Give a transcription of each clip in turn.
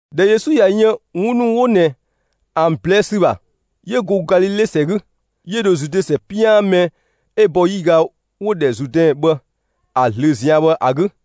꞊Dhɛ Yesu ꞊ya yën 'wun ‑nu 'wo ꞊nɛ ‑an ꞊blɛɛ' ‑sü ‑bha, 'yö go Galile ‑sɛ 'gü, 'yö dho Zude ‑sɛ 'pian mɛ 'ö bɔ 'yiga 'wo‑ ‑dhɛ Zuudɛn bhë ‑a ꞊zlöö ꞊zian' bhë ‑a 'gü.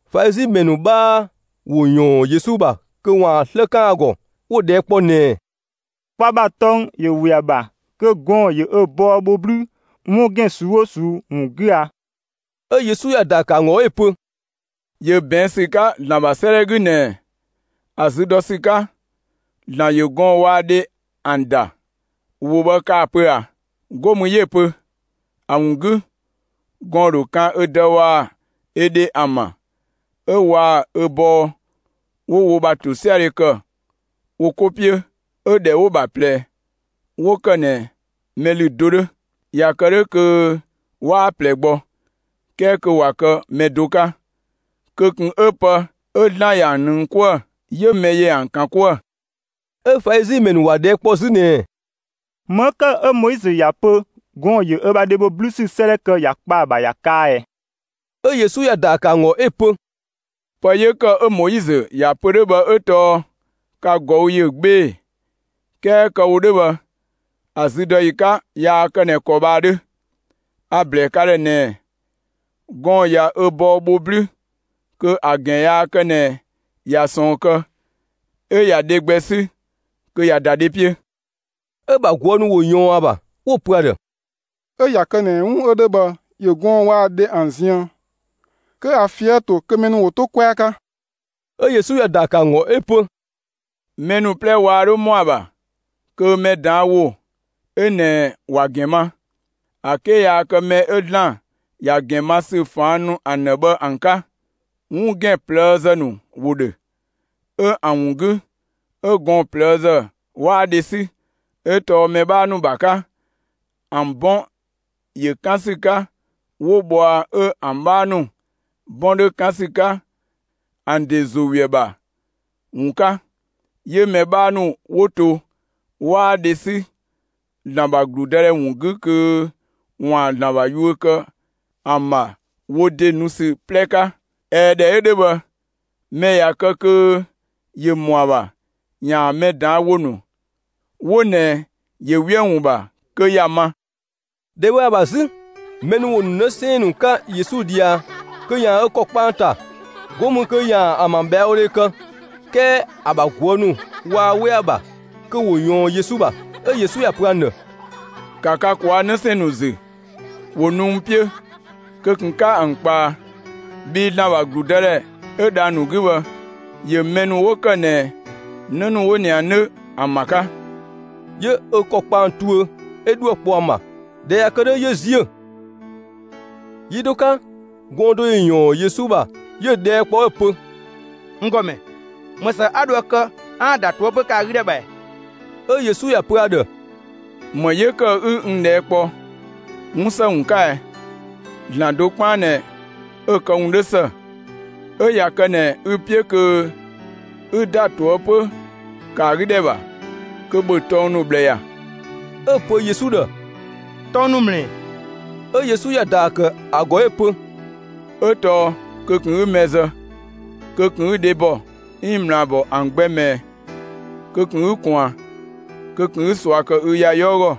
Falizi ‑mɛ ‑nu 'bhaa ‑wo ‑yɔɔn Yesu ‑bha kö ‑waan 'slë 'kan ‑a ‑gɔ. 'Wo‑ ꞊dhɛɛ' kpɔ ꞊nɛɛ: «Kwa ‑bha tɔng ‑yö ‑we ‑a ‑bha kö gɔɔn‑ ‑yö ö bɔɔ bho 'blüü 'wun ‑gɛn ꞊suu'‑ 'oo ꞊suu'‑ ‑wun 'gü a?» 'Ö Yesu ‑ya ‑daa ‑kë ‑an ‑gɔ 'ö‑ pö: «‑Yö ꞊bɛɛn' ‑sü 'ka ‑Zlan ‑bha 'sëëdhɛ 'gü ꞊nɛɛ: ‑A zü dɔ ‑sü 'ka, ‑Zlan ‑yö gɔɔn‑ waa‑ dhe ‑an ‑da. ‑Wo bhë kaa‑ pö ꞊a? 'Go mü 'yö‑ pö: ‑A ‑wun 'gü, gɔɔn‑ ‑dho kan ö dë waa‑ ö dhe ‑an ‑bha 'ö waa‑ ö bɔɔ 'wo wo ‑bha ‑tosiadhe kë wo 'ko 'piö. 'Ö ‑dhɛ 'wo‑ ‑bha ꞊plɛ 'wo ‑kë ꞊nɛ mɛ ‑lü do 'dhö. ꞊Ya kë 'dhö kö 'waa ꞊plɛ gbɔ, 'kɛɛ kö ꞊wa kë mɛ do 'ka; kö ꞊kun 'ö pë 'ö ‑Zlan ꞊ya ‑an ꞊nëng 'kuë‑, 'yö mɛ ‑yö ‑an ‑kan 'kuë‑.» 'Ö Falizi ‑mɛ ‑nu ‑wa ꞊dhɛɛ' kpɔ 'zü ꞊nɛɛ: «‑Më 'ö ‑kë 'ö Moizö ‑ya pö gɔɔn‑ ‑yö ö bha dhe ‑bho 'blüü ‑sü 'sëëdhɛ kë ‑ya kpa ‑a ‑bha ‑ya kaa ꞊ɛ?» 'Ö Yesu ‑ya ‑daa ‑kë ‑an ‑gɔ 'ö‑ pö: «Pë 'yö ‑kë 'ö Moizö ‑ya pö 'dhö bhë 'ö tɔɔ ka ꞊gɔü' ‑yö 'gbee‑, 'kɛɛ kë‑ wo 'dhö bhë, ‑a züdɔyi 'ka yaa kë ꞊nɛ ‑kɔ bhë ‑a 'dhö. A‑ ‑blɛɛ ka ‑dhë ꞊nɛɛ: Gɔɔn‑ ꞊ya ö bɔɔ bho 'blüü kö ‑a ‑gɛn yaa kë ꞊nɛ ꞊ya ꞊sɔɔn kë, 'ö ꞊ya dhe gbɛ 'sü kö ꞊ya ‑da dhe 'piö.» 'Ö‑ ‑bha ꞊guë' ‑nu ‑wo ꞊yɔɔn ‑a ‑bha, 'wo‑ pö ‑a ‑dhë: «'Ö ꞊ya kë ꞊nɛ 'wun 'ö 'dhö bhë ‑yö gɔɔn‑ waa‑ dhe ‑an ziën, kö ‑a ꞊fië' ‑to kö mɛ ‑nu ‑wo 'to 'kwɛa 'ka!» 'Ö Yesu ‑ya ‑daa ‑kë ‑an ‑gɔ 'ö‑ pö: «Mɛ ‑nu 'plɛ waa 'dho ‑mɔ ‑a ‑bha kö mɛ ꞊daan' ‑wo 'ö ꞊nɛ ‑wa ‑gɛn ma, ‑a 'ke yaa kë mɛ ‑nu 'ö ‑Zlan ‑ya ‑a ‑gɛn ma ‑sü ꞊faan' nu ‑an ‑dhë bhë ‑an 'ka. 'Wun ‑gɛn ꞊plëëzë ‑nu ‑wo ‑dhö, 'ö ‑an ‑wun 'gü, 'ö gɔɔn‑ ꞊plëëzë 'waa dhe 'sü. 'Ö tɔɔ mɛ 'bhaa ‑nu ‑bha 'ka, ‑an 'bɔn ‑yö 'kan ‑sü 'ka 'wo bhɔa 'ö ‑an 'bhaa ‑nu 'bɔn 'dhö 'kan ‑sü 'ka ‑an ‑de ‑zo we ‑a ‑bha ‑wun 'ka. 'Yö‑ mɛ 'bhaa ‑nu 'wo to, 'waa dhe 'sü ‑Zlan ‑bha ‑gludëdhɛ ‑wun 'gü kö ‑waan ‑Zlan ‑bha yuö kë ‑an ‑bha wo ‑de nu ‑sü 'plɛ 'ka. ꞊Ɛɛ, ꞊dhɛ 'ö 'dhö bhë, mɛ ꞊ya kë kö ‑yö ‑mɔ ‑a ‑bha ‑yaan mɛ ꞊daan' ‑wo ‑nu 'wo ꞊nɛ ‑yö ‑we ‑an ‑wun ‑bha, kö ‑ya ma!» ‑Dhɛ bhë ‑a ‑bha 'zü, mɛ ‑nu ‑wo ‑nu 'në 'sɛɛn‑ ‑nu 'ka Yesu ꞊dhia kö ‑yaan ö ‑kɔ kpa ‑an ‑ta, 'go mü kö ‑yaan ‑an ‑bha ꞊bhɛawodhe kë; 'kɛɛ ‑a ‑bha ꞊guë' ‑nu waa 'we ‑a ‑bha kö ‑wo ꞊yɔɔn Yesu ‑bha. 'Ö Yesu ‑ya pö ‑an ‑dhë: «‑Ka ka ꞊kwaa' 'në 'sɛɛn‑ ‑nu ‑zü, ‑wo nu n 'piö! Kö ꞊kun 'ka ‑an ꞊kpaa, bhii ‑Zlan ‑bha ‑gludëdhɛ 'ö dhang‑ ‑nu 'gü bhë, ‑yö mɛ ‑nu 'wo ‑kë ꞊nɛ 'në ‑nu 'wo ꞊nɛ ‑an 'dhö, ‑an ‑bha 'ka.» 'Yö ö ‑kɔ kpa ‑an tuö, ('ö 'dhuë‑ kpɔ ‑an ‑bha). ꞊Dhɛ ꞊ya kë 'dhö, 'yö ‑ziö. Yi do 'ka, gɔɔn‑ do ‑yö ‑yɔɔn Yesu ‑bha, 'yö‑ ꞊dhɛɛ' kpɔ 'ö‑ pö: «N ‑Gɔmɛ, ‑më ‑së 'a dho ‑a kë 'aan‑ ‑da ꞊toëpö ‑kë ‑a 'gü ‑dhɛ ‑bha ‑ɛ?» 'Ö Yesu ‑ya pö ‑a ‑dhë: «‑Më 'yö ‑kë 'ü n ꞊dhɛɛ' kpɔ 'wun ‑së ‑wun 'ka ɛ? ‑Zlan do 'kpaan ꞊nɛ 'ö‑ këwun 'dho ‑së. 'Ö ꞊ya kë ꞊nɛ ü‑ 'piö kö 'ü ‑da ꞊toëpö ‑kë ‑a 'gü ‑dhɛ ‑bha, kö ‑bhö tɔng ‑nu ꞊bhlë ‑ya!» 'Ö‑ pö Yesu ‑dhë: «Tɔng ‑nu ‑mlë ‑ɛ?» 'Ö Yesu ‑ya ‑daa ‑kë ‑a ‑gɔ 'ö‑ pö: «'Ö tɔɔ: Kö ꞊kun 'ü mɛ zë; kö ꞊kun 'ü dhebɔ 'iin ꞊mlaabɔ ‑an gbɛ ꞊mɛɛ; kö ꞊kun 'ü ꞊kwaan; kö ꞊kun 'ü ꞊sua kë ü ‑ya 'yɔɔ ‑gɔ;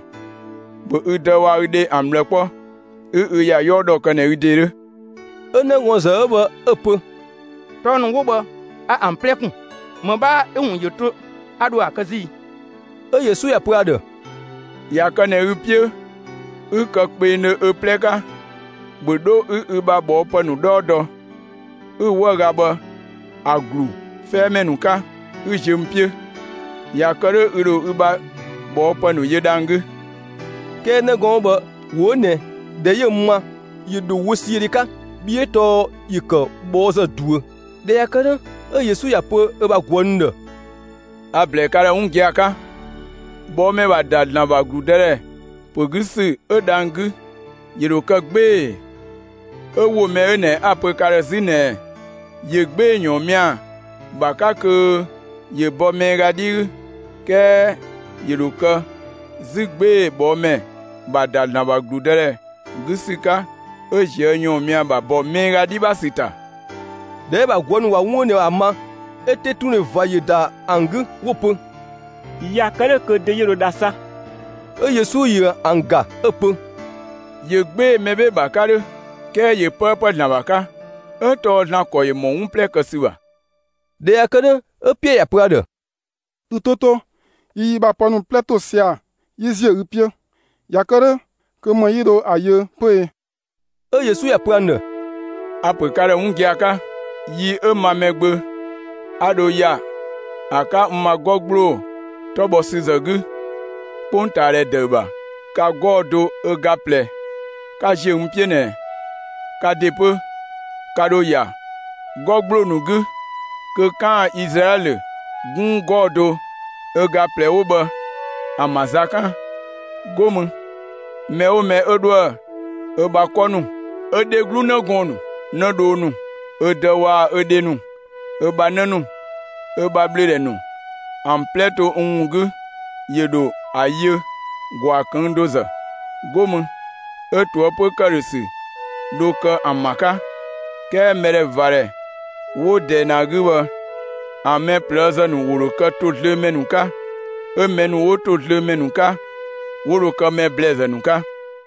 ‑bhö ü dë waa‑ ü dhe ‑an ꞊bhlë 'kpɔ; 'ü ü ‑ya 'yɔɔ ‑dhɔ kë ꞊nɛ ü ‑de 'dhö!» 'Ö 'nëgɔɔnzë 'ö bhë 'ö‑ pö: «Tɔng ‑nu 'wo bhë a ‑an 'plɛ kun. ‑Më 'bhaa 'ö‑ ‑wun ‑yö to 'a dho a‑ kë 'zü i?» 'Ö Yesu ‑ya pö ‑a ‑dhë: «꞊Ya kë ꞊nɛ ü‑ 'piö 'ü kë kpengdhö ö 'plɛ 'ka, ‑bhö 'dho 'ü ü ‑bha kɔɔpë ‑nu 'dhɔɔ dɔ, 'ü‑ 'wëüga bhë ‑a ‑glu 'fɛɛmɛ ‑nu 'ka, 'ü ziö n 'piö! ꞊Ya kë 'dhö ü ‑dho ü ‑bha ꞊bhɔɔpë ‑nu yö dhang‑ 'gü.» 'Kɛɛ 'në gɔɔn‑ 'ö bhë ‑wo 'ö ꞊nɛ, ꞊dhɛ 'yö‑ ma, ‑yö dho wösiödhe 'ka, bhii 'ö tɔɔ ‑yö ‑kë ꞊bhɔɔzë ꞊duö. ꞊Dhɛ ꞊ya kë 'dhö, 'ö Yesu ‑ya pö ö bha ꞊guë' ‑nu ‑dhë: «A‑ ‑blɛɛ ka ‑dhë 'wun gia‑ 'ka: ꞊Bhɔɔmɛ ‑bha ‑da ‑Zlan ‑bha ‑gludëdhɛ ‑pö 'gü ‑sü 'ö dhang‑ 'gü, ‑yö ‑dho kë 'gbee‑. 'Ö ‑wo mɛ 'ö ꞊nɛ 'a‑ ‑pö ka ‑dhë 'zü ꞊nɛɛ: ‑Yö 'gbee‑ ‑yɔɔnmia ‑bha 'ka kö ‑yö bɔ miiga 'dhi 'gü, 'kɛɛ ‑yö ‑dho kë 'zü 'gbee‑ ꞊bhɔɔmɛ ‑bha ‑da ‑Zlan ‑bha ‑gludëdhɛ 'gü ‑sü 'ka 'ö ꞊zië' ‑yɔɔnmia ‑bha ‑bɔ miiga 'dhi ‑bha ‑sü ‑ta.» ꞊Dhɛ 'ö‑ ‑bha ꞊guë' ‑nu ꞊wa 'wun 'ö ꞊nɛ ‑a ma, 'ö 'tetundhe ꞊va ‑yö ‑da ‑an 'gü 'wo‑ pö: «꞊Ya kë 'dhö kö dö 'yö dho dha 'sa?» 'Ö Yesu ‑yö ‑an ‑ga, 'ö‑ pö: «‑Yö 'gbee‑ mɛ 'bhee‑ ‑bha 'ka 'dhö, 'kɛɛ ‑yö 'pëëpë ‑Zlan ‑bha 'ka, 'ö tɔɔ ‑Zlan ‑kɔ ‑yö ‑mɔ 'wun 'plɛ kë ‑sü ‑bha.» ꞊Dhɛ ꞊ya kë 'dhö, 'ö Piɛɛ ‑ya pö ‑a ‑dhë: «Ü 'to 'to, yi yi ‑bha pë ‑nu 'plɛ ‑to sia‑ 'yi ‑ziö ü 'piö. ꞊Ya kë 'dhö, kö ‑më 'yi dho ‑a yö 'pö e?» 'Ö Yesu ‑ya pö ‑an ‑dhë: «A‑ ‑pö ka ‑dhë 'wun gia‑ 'ka: Yi 'ö ma Mɛgbö 'a dho ‑ya ‑a 'ka n ma 'gɔ ‑gbloo 'tɔ bhɔ ‑sü ‑zë 'gü 'kpongtaadhɛ ‑dëü ‑bha, ka 'gɔɔ‑ do ö ga ꞊plɛ, 'ka ‑ziö n 'piö ꞊nɛ, ka ‑de 'pö ka ‑dho ‑ya 'gɔ ‑gbloo ‑nu 'gü kö 'kaan‑ Izlaɛlö 'gunng 'gɔɔ‑ do ö ga ꞊plɛ 'wo bhë ‑an ‑bha za 'kan. 'Go mü, mɛ 'oo mɛ 'ö 'dhoë‑ ö bha 'kɔ ‑nu, ö dheglu 'në gɔɔn‑ ‑nu, 'nëdhoo ‑nu, ö dë ‑nu waa‑ ö dhe ‑nu, ö bha 'në ‑nu, ö bha ꞊bhlöödhɛ ‑nu ‑an 'plɛ to n ‑wun 'gü, ‑yö ‑dho ‑a yö ‑gwaa ꞊këng' do ‑zë. 'Go mü, 'ö ꞊toëpö ‑këdhösü dho kë ‑an ‑bha 'ka. 'Kɛɛ mɛdhɛvadhɛ 'wo ꞊dɛɛ ꞊nɛ ‑a 'gü bhë, ‑an mɛ ‑blɛɛzë ‑nu ‑wo ‑dho kë ‑tozlöömɛ ‑nu 'ka; 'ö mɛ ‑nu 'wo ‑tozlöömɛ ‑nu 'ka, 'wo dho kë mɛ ‑blɛɛzë ‑nu 'ka.»